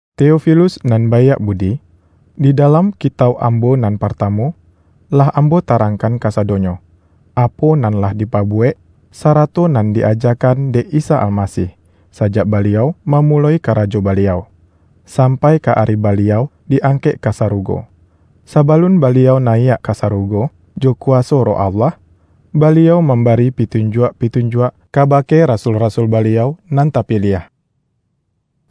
Teofilus nan baiak budi, Di dalam kitauk ambo nan partamu, lah ambo tarangkan kasadonyo, apo nan lah dipabuwek, sarato nan di-ajakan dek Isa Almasih, sajak Baliau mamuloi karajo Baliau, sampai ka ari Baliau di-angkek ka sarugo. Sabalun Baliau nayiak ka sarugo, jo kuwaso Roh Allah, Baliau mambari pitunjuak-pitunjuak, kabake rasul-rasul Baliau nan tapiliah.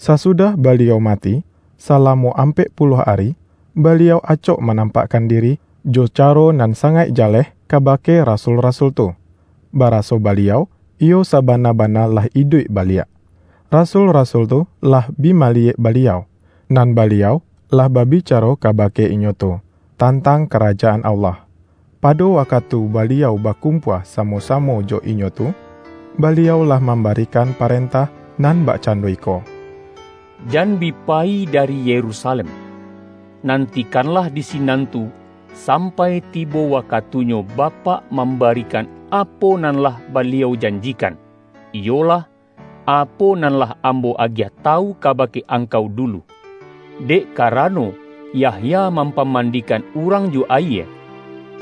Sasudah Baliau mati, salamo ampek puluah ari Baliau acok manampakkan diri, jo caro nan sangaik jaleh kabake rasul-rasul tu, baraso Baliau iyo sabana-bana lah iduik baliak. Rasul-rasul tu lah bi maliyek Baliau, nan Baliau lah babicaro kabake inyo tu, tantang Karajaan Allah. Pado wakatu Baliau bakumpua samo-samo jo inyo tu, Baliau lah mambarikan parentah nan bakcando iko,”Jan bi payi dari Yerusalem. Nantikanlah di sinan tu, sampai tibo wakatunyo Bapak mambarikan apo nan lah Baliau janjikan, iyolah, apo nan lah Ambo agiah tawu kabake angkau dulu. Dek karano, Yahya mampamandikan urang jo ayie,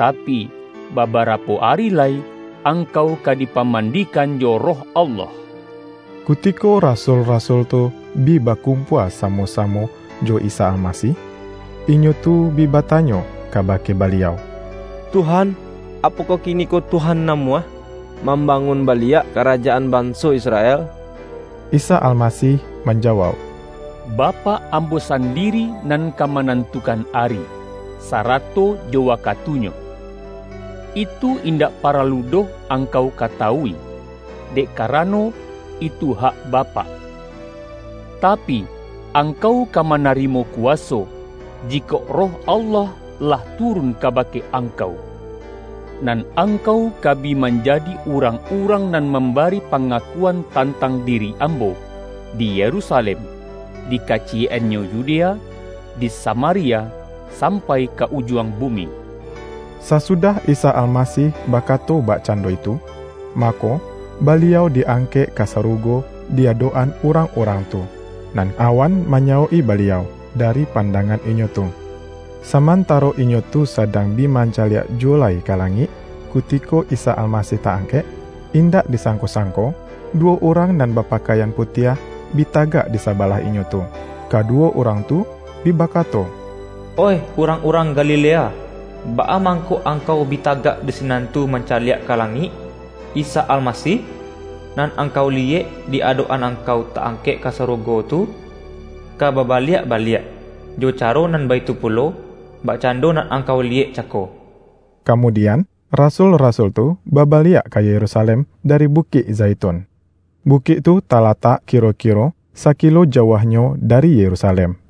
tapi, babarapo ari lai, angkau ka dipamandikan jo Roh Allah.” Kutiko rasul-rasul tu bi bakumpua samo-samo jo Isa Almasih, inyo tu bi batanyo kabake Baliau,”Tuhan, apokoh kiniko Tuhan namuah, mambangun baliak karajaan banso Israel?” Isa Almasih manjawauk,”Bapak Ambo sandiri nan ka manantukan ari, sarato jo wakatunyo. Itu indak paralu doh angkau katawui, dek karano, itu hak Bapak. Tapi, angkau ka manarimo kuwaso, jikok Roh Allah lah turun kabake angkau. Nan angkau, ka bi manjadi urang-urang nan mambari pangakuan tantang diri Ambo, di Yerusalem, di kaciyek-annyo Yudea, di Samaria, sampai ka ujuang bumi.” Sasudah Isa Almasih bakato bakcando itu, mako, Baliau di-angkek ka sarugo di adok-an urang-urang tu, nan awan manyawok-i Baliau, dari pandangan inyo tu. Samantaro inyo tu sadang bi mancaliak juwo lai ka langik, kutiko Isa Almasih ta-angkek, indak disangko-sangko, duwo urang nan bapakaian putiah, bi tagak di sabalah inyo tu. Kaduwo urang tu bi bakato,”Oih urang-urang Galilea, baa mangko angkau bi tagak di sinan tu mancaliak ka langik? Isa Almasih, nan angkau liyek di-adok-an angkau ta-angkek ka sarugo tu, ka babaliak baliak, jo caro nan baitu pulo, bakcando nan angkau liyek cako.” Kamudian, rasul-rasul tu babaliak ka Yerusalem dari Bukik Zaitun. Bukik tu talatak kiro-kiro sakilo jauahnyo dari Yerusalem.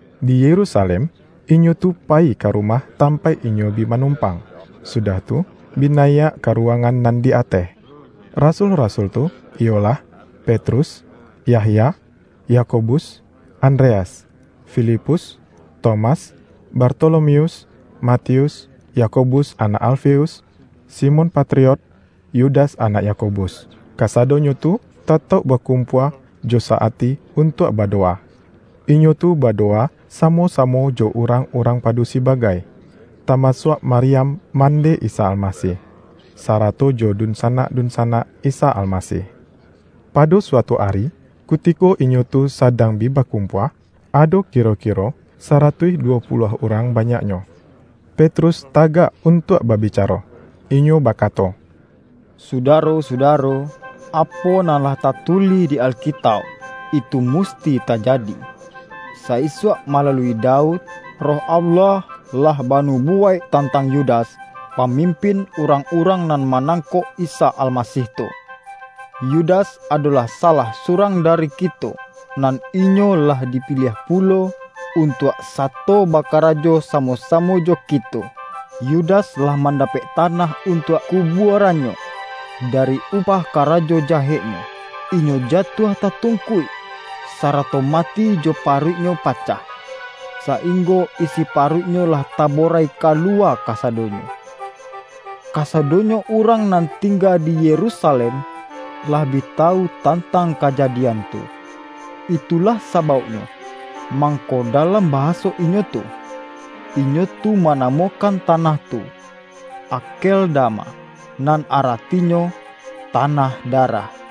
Di Yerusalem inyo tu payi ka rumah tampaik inyo bi manompang, sudah tu, bi nayiak ka ruwangan nan di ateh. Rasul-rasul tu, iyolah Petrus, Yahya, Yakobus, Andreas, Filipus, Tomas, Bartolomeus, Matius, Yakobus anak Alfeus, Simon Patriot, Yudas anak Yakobus; kasadonyo tu tatauk bakumpua jo sa-ati untuak badowa. Inyo tu badowa samo-samo jo urang-urang padusi bagai, tamasuak Maryam mandeh Isa Almasih, sarato jo dunsanak-dunsanak Isa Almasih. Pado suatu ari, kutiko inyo tu sadang bi bakumpua — ado kiro-kiro saratuih duwo puluah urang banyaknyo — Petrus tagak untuak babicaro. Inyo bakato, ”Sudaro-sudaro! Apo nan lah tatulih di Alkitauk, itu musti tajadi. Sa-isuak malalui Daud, Roh Allah lah banubuwaik tantang Yudas, pamimpin urang-urang nan manangkok Isa Almasih tu. Yudas adolah salah surang dari kito, nan inyo lah dipiliah pulo untuak sato bakarajo samo-samo jo kito.” ( Yudas lah mandapek tanah untuak kubuarannyo, dari upah karajo jaheknyo. Inyo jatuah tatungkuik, sarato mati jo paruiknyo pacah, sainggo isi paruiknyo lah taborai kaluwa kasadonyo. Kasadonyo urang nan tingga di Yerusalem lah bi tawu tantang kajadian tu. Itulah sabauknyo, mangko dalam bahaso inyo tu, inyo tu manamokan tanah tu Akeldama, nan aratinyo, ’Tanah darah'.)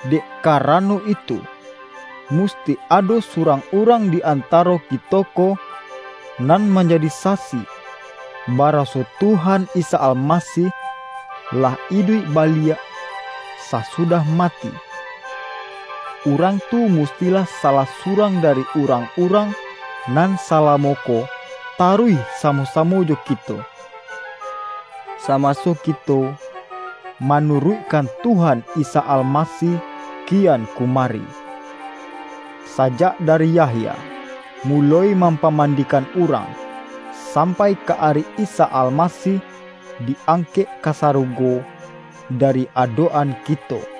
Dek karano itu, musti ado surang urang di antaro kito ko, nan manjadi sasi baraso Tuhan Isa Almasih lah iduik baliak sasudah mati. Urang tu, mustilah salah surang dari urang-urang nan salamo ko taruih samo-samo jo kito, samaso kito manuruikkan Tuhan Isa Almasih kian kumari, sajak dari Yahya muloi mampamandikan urang, sampai ka ari Isa Almasih di angkek ka sarugo dari adok-an kito.”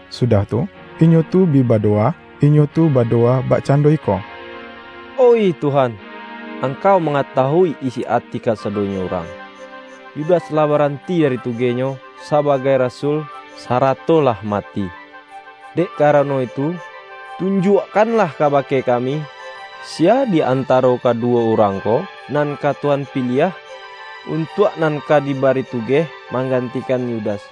Sudah tu, inyo tu bi badowa. Inyo tu badowa bakcando iko,”Oih Tuhan, Angkau mangatawui isi ati kasadonyo urang. Yudas lah baranti dari tugehnyo sabagai rasul, sarato lah mati. Dek karano itu, tunjuakkanlah kabake kami, siya di antaro kaduwo urang ko nan ka Tuhan piliah, untuak nan ka dibari tugeh manggantikan Yudas.”